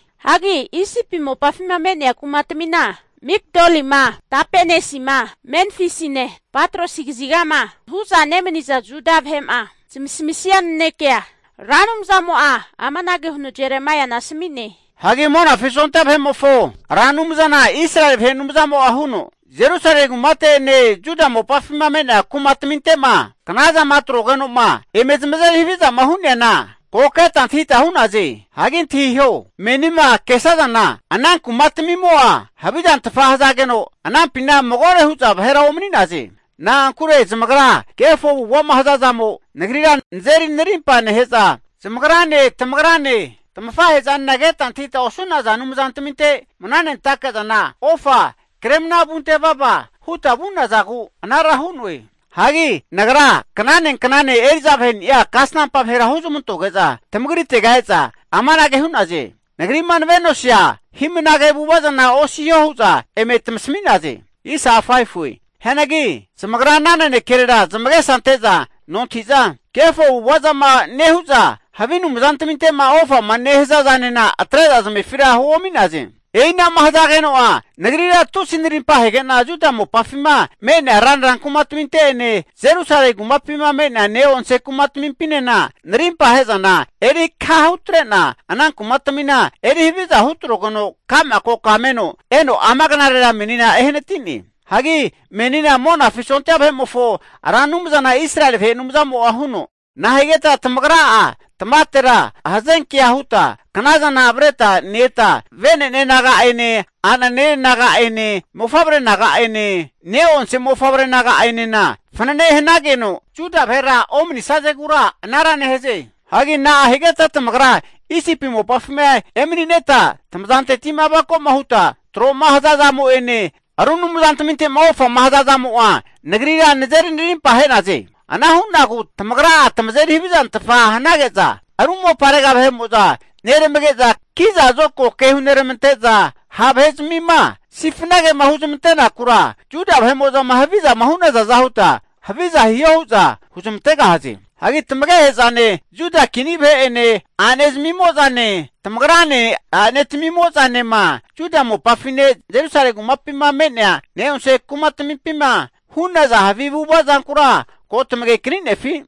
Hagi Isipi mopafima me'nea kumatamina, Migdolima, Tapanesima, Memfisine, Patrosi kazigama hu'za nemani'naza Juda vahe'ma zamasamisia nanekea Ra Anumzamo'a amanage huno Jeremaiana asami'ne. Hagi Monafi sondia vahe'mofo Ra Anumzana Israeli vahe Anumzamo'a huno, Jerusalemi kumate'ene, Juda mopafima me'nea kuma taminte'ma knazama atrogeno'ma eme zamazeri havizama hu'neana, ko keta antahita hu'naze. Hagi antahiho, menima kesazana ana kuma tamimo'a havizantfa hazageno, anampina magore hu'za vahera omani'naze. Na'ankure zamagra kefo avu'ava'ma hazazamo Nagrira nazeri narimpa nehe'za, zamagrane, tamagrane, tamafahe'zanena keta antahita osu'naza anumzaraminte mnanentake zana ofa kremna vunte vavama huta vu'nazagu anara hu'noe. Hagi Nagra knane knane eri'za vaheni'a kasampa vahera huzmantoge'za tamagritega e'za, amanage hu'naze. Nagri'ma nave'nosia hi'mnage avu'ava zana osiho hu'za eme tamasami'naze. Hianagi zamagra ana nanekerera zamagesa ante'za nontahi'za, kefo avu'ava zama nehu'za havi anumzantaminte'ma ofama nehaza zanena atre'za zamefira huomi'naze. E'ina'ma hazageno'a Nagrira tusi narimpa ahege'na Juda mopafima me'nea ranra kumataminte'ene Jerusalemi kumapima me'nea ne'onse kantamimpinena narimpa ahe'zana eri kaha hutre'na ana kumatamina eri haviza hutrogeno ka'ma koka meno eno ama knarera menina ehanati'ne. Hagi menina Monafi sondia vahe'mofo Ra Anumzana Israeli vahe Anumzamo'a huno, Nahigeta tamagra'a tamavatera hazenkea huta knazana avreta ne-eta venene naga'ene a'nanene naga'ene mofavre naga'ene, ne'onse mofavre naga'enena fanane hanageno Juda vahera omani'sazegura anara nehaze? Hagi nahigeta tamagra Isipi mopafima emanineta tamazanteti'ma avako'ma huta tro'ma haza zamo'ene, ru anumzantaminte'ma ofama hazazamo'a Nagrira nazeri narimpa ahe'naze? Ana hu'nagu tamagra'a tamazeri havizantfa hanage'za, ru moparega vahe'mo'za neramage'za kizazokago ke huneramante'za, ha' vahezamima sifnagema huzmante'nakura, Juda vahe'mo'zama havizama hu'nazaza huta haviza hiho hu'za huzamantegahaze. Hagi tamagehe'zane, Juda kini vahe'ene a'ne zamimo'zane, tamagrane a'ne tamimo'zanema, Juda mopafine Jerusalemi kumapima me'nea ne'onse kantamimpima hu'naza havi avu'ava zankura ko tamage kani'nefi?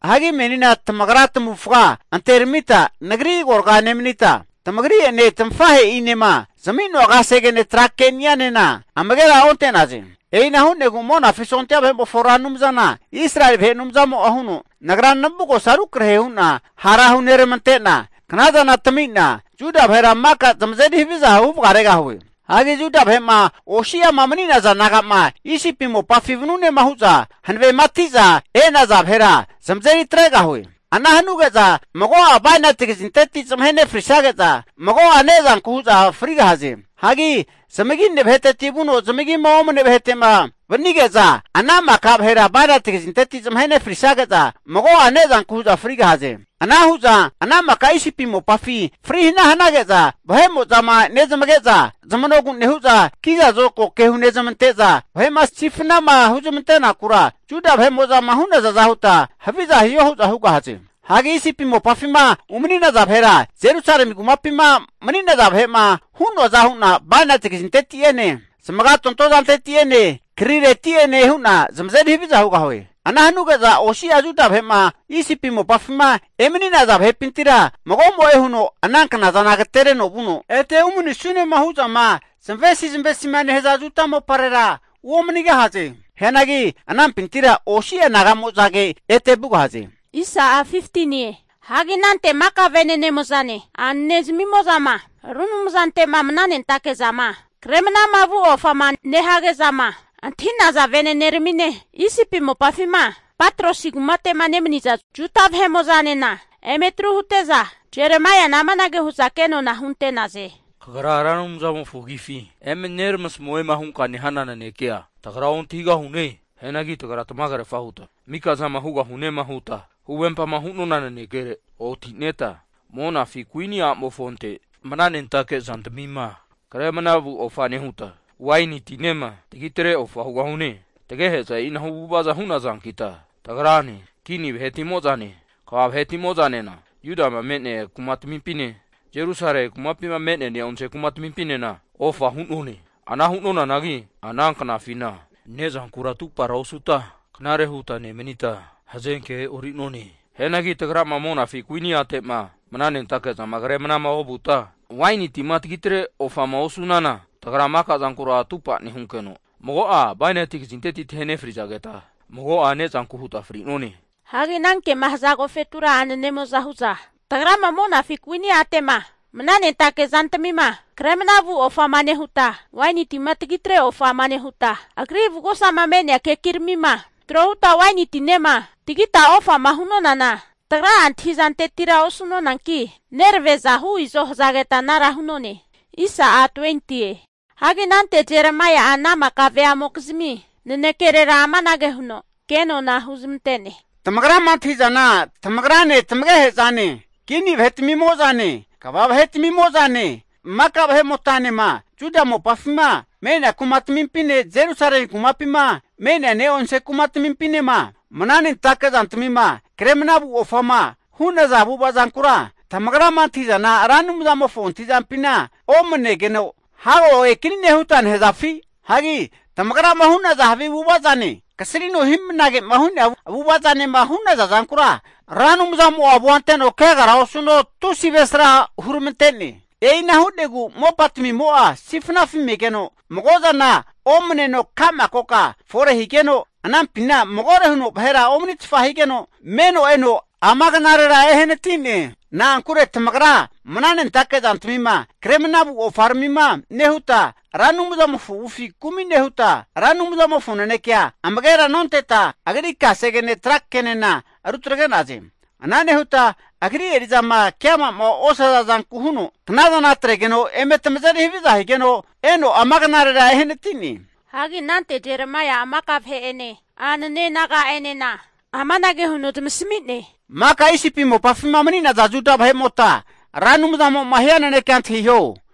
Hagi meninena tamagra tamavufga anteramita Nagri agorga nomanita, tamagri'ene tamafahe'inema zami'noa kasegene tra keni'anena amagera onte'naze. E'ina hu'negu Monafi sondia vahe'mofo Ra Anumzana Israeli vahe Anumzamo'a huno, Nagra navugosa rukrahe hu'na hara huneramantena knazana tami'na Juda vahera maka tamazeri haviza huvagaregahue. Hagi Juda vahe'ma osi'ama mani'naza naga'ma, Isipi mopafi vanunema hu'za hanavemati'za e'naza vahera zamazeri tregahue. Ana hanuge'za mago'a bainati kazinteti zamahe nefrisage'za, mago'a ne'zanku hu'za frigahaze. Hagi zamagine vaheteti vuno zamagima omane vahete'ma vanige'za ana maka vahera bainati kazinteti zamahe nefrisage'za mago'a ne'zanku hu'za frigahaze. Ana hu'za ana maka Isipi mopafi fri hana hanage'za, vahe'mo'zama nezamage'za zamanogu nehu'za, kiza zokago ke hunezamante'za, vahe'ma sifnama huzmante'nakura Juda vahe'mo'zama hu'nazaza huta haviza hiho hu'za hugahaze. Hagi Isipi mopafima umani'naza vahera, Jerusalemi kumapima mani'naza vahe'ma hu'noaza hu'na bainati kazinteti'ene, zamagatonto zanteti'ene, krireti'ene hu'na zamazeri haviza hugahue. Ana hanuge'za osi'a Juda vahe'ma Isipi mopafima emani'naza vahepintira magomo'e huno ana knazana agatereno vuno, ete umanisunema hu'zama zamavesi zamavesi'ma nehaza Juda moparera uomanigahaze. Hianagi anampintira osi'a naga'mozage ete vugahaze. Hagi anante maka vene'nemo'zane, a'nezmimo'zama ru anumzante'ma mananentake zama kre mnama vu ofama nehage'zama antahi'naza vene'neramine, Isipi mopafima Patrosi kumate'ma nemaniza Juda vahe'mo'zanena eme atru hute'za Jeremaiana amanage hu'za kenona hunte'naze. Kagra Ra Anumzamofo agifi eme neramasamuema hunka nehana nanekea tagra ontahigahune. Hianagi tagra tamagerfa huta mikazama hugahunema huta huvempama hu'nona nanekere otineta, monafi kuini a'mofonte mananentake zantamima kre mnavu ofa nehuta, waini tinema tagitreta ofa hugahune. Tagehe'za e'inahu avu'ava hu'nazankita tagrane, kini vahetimo'zane, kva vahetimo'zanena Judama me'nea kumatamimpine, Jerusalemi kumapima me'nea ne'onse kantamimpinena ofa hu'none. Ana hu'nonanagi ana knafina ne'zankura atupara osuta knare huta nemanita, hazenkea e'ori'none. Hianagi tagrama monafi kuini ate'ma mananentake zama kre manama ovuta, waini tima tagi tre ofama osu'nana, tagra maka zankura atupa nehunkeno, mago'a bainati kazinteti tahe nefrizageta, mago'a ne'zanku huta fri'none. Hagi anankema haza agofetura a'nemo'za hu'za, tagrama monafi kuini a'te'ma mananentake zantamima kre manavu ofama nehuta, waini tima tagi tre ofama nehuta, agri avugosama me'nea kekiramima tro huta waini tinema tagita ofama hu'nonana, tagra'a antahi zantetira osu'nonanki nerave'za hu izo hazageta anara hu'none. Hagi anante Jeremaia'a ana maka veamokizmi nanekerera amanage huno ke nona huzmante'ne. Tamagrama antahi'zana tamagrane tamagehe'zane, kini vahetamimo'zane, kva vahe'tamimo'zane, maka vahe'motanema Juda mopafima me'nea kumatamimpine Jerusalemi kumapima me'nea ne'onse kantamimpinema, mana nentake zantamima kre mnavu ofama hu'naza avu'ava zankura, tamagrama antahi'zana Ra Anumzamofo antahi'zampina omanegeno hago agekanine huta nehazafi? Hagi tamagrama hu'naza havi avu'ava zane, kasrino hi'mnage'ma hu'nea avu'ava zanema hu'naza zankura Ra Anumzamo'a avua anteno kegara osuno tusi avesra huramante'ne. E'ina hu'negu mopatamimo'a sifnafi megeno, mago zana omaneno ka'ma koka fore higeno, anampina magore huno vahera omanitfa higeno, meno eno ama knarera ehanati'ne. Na'ankure tamagra mananentake zantamima kre mnavu ofaramima nehuta, Ra Anumzamofo avufi kumi nehuta, Ra Anumzamofo nanekea amagera nonteta, agri kasegene tra kenena rutagre'naze. Ana nehuta Agri eri'zama keama'ma osaza zanku huno knazana atregeno eme tamazeri haviza higeno, eno ama knarera ehanati'ne. Hagi anante Jeremaia'a maka vahe'ene a'nene naga'enena amanage huno zamasami'ne. Maka Isipi mopafima mani'naza Juda vahe'mota Ra Anumzamo'ma hia nanenkea antahiho.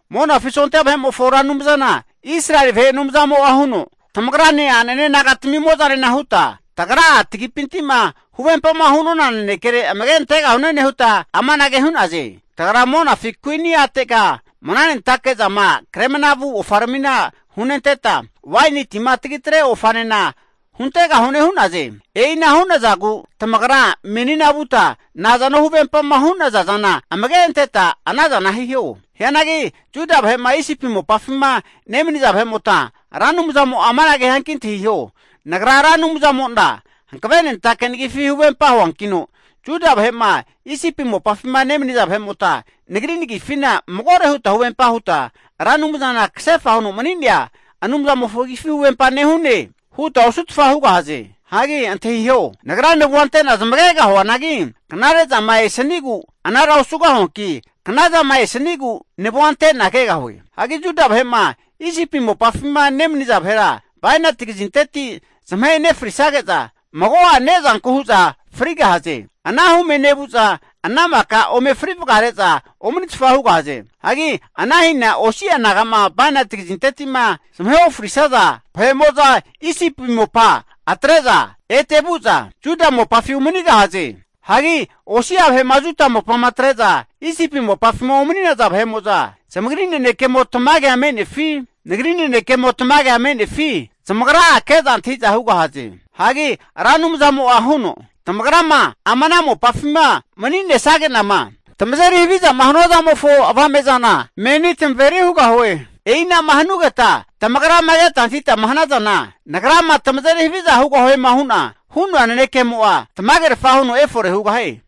Monafi sondia vahe'mofo Ra Anumzana Israeli vahe Anumzamo'a huno, Tamagrane a'nene naga'tamimo'zanena huta, tagra'a tagipinti'ma huvempama hu'nona nanekere amage antegahune nehuta amanage hu'naze. Tagra monafi kuini a'tega mananentake zama kre mnavu ofaramina hunenteta, waini tima tagitre ofanena huntegahune hu'naze. E'ina hu'nazagu tamagra menina vuta nazano huvempama hu'naza zana amage anteta anazana hiho. Hianagi Juda vahe'ma Isipi mopafima nemaniza vahe'mota Ra Anumzamo'a amanage hianki antahiho, Nagra Ra Anumzamo'na hankavenentake nagifi huvempa huankino, Juda vahe'ma Isipi mopafima nemaniza vahe'mota Nagri nagifina magore huta huvempa huta, Ra Anumzana kasefa huno mani'nea Anumzamofo agifi huvempa nehune huta osutfa hugahaze. Hagi antahiho! Nagra navua ante'na zamagegahuanagi, knare zama esanigu anara osugahuanki, knazama esanigu navua ante'na kegahue. Hagi Juda vahe'ma Isipi mopafima nemaniza vahera, bainati kazinteti zamahe nefrisage'za, mago'a ne'zanku hu'za frigahaze. Ana hume nevu'za ana maka ome fri vagare'za omanitfa hugahaze. Hagi ana hina osi'a naga'ma bainati kazinteti'ma zamahe ofrisaza vahe'mo'za Isipi mopa atre'za ete vu'za, Juda mopafi umanigahaze. Hagi osi'a vahe'ma Juda mopama atre'za Isipi mopafima umani'naza vahe'mo'za zamagri nanekemo tamagea me'nefi, Nagri nanekemo tamagea me'nefi zamagra'a ke'za antahi'za hugahaze. Hagi Ra Anumzamo'a huno, Tamagrama ama ana mopafima mani'nesage'nama tamazeri havizama hanua zamofo avame'zana meni tamaveri hugahue. E'ina'ma hanugeta tamagrama keta antahitama hanazana, Nagrama tamazeri haviza hugahuema hu'na hu'noa nanekemo'a, tamagerfa huno efore hugahie.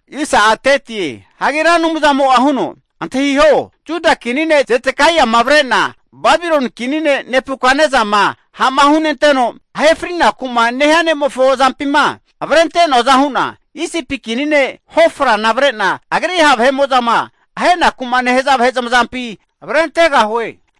Hagi Ra Anumzamo'a huno, Antahiho! Juda kini ne' Zedekaiama avre'na, Babiloni kini ne' Nebukatnesama ha'ma hunenteno ahe frinaku'ma nehia ne'mofo azampima avrente'noaza hu'na, Isipi kini ne' Hofrana avre'na, agri ha' vahe'mo'zama ahenaku'ma nehaza vahe zamazampi avrentegahue.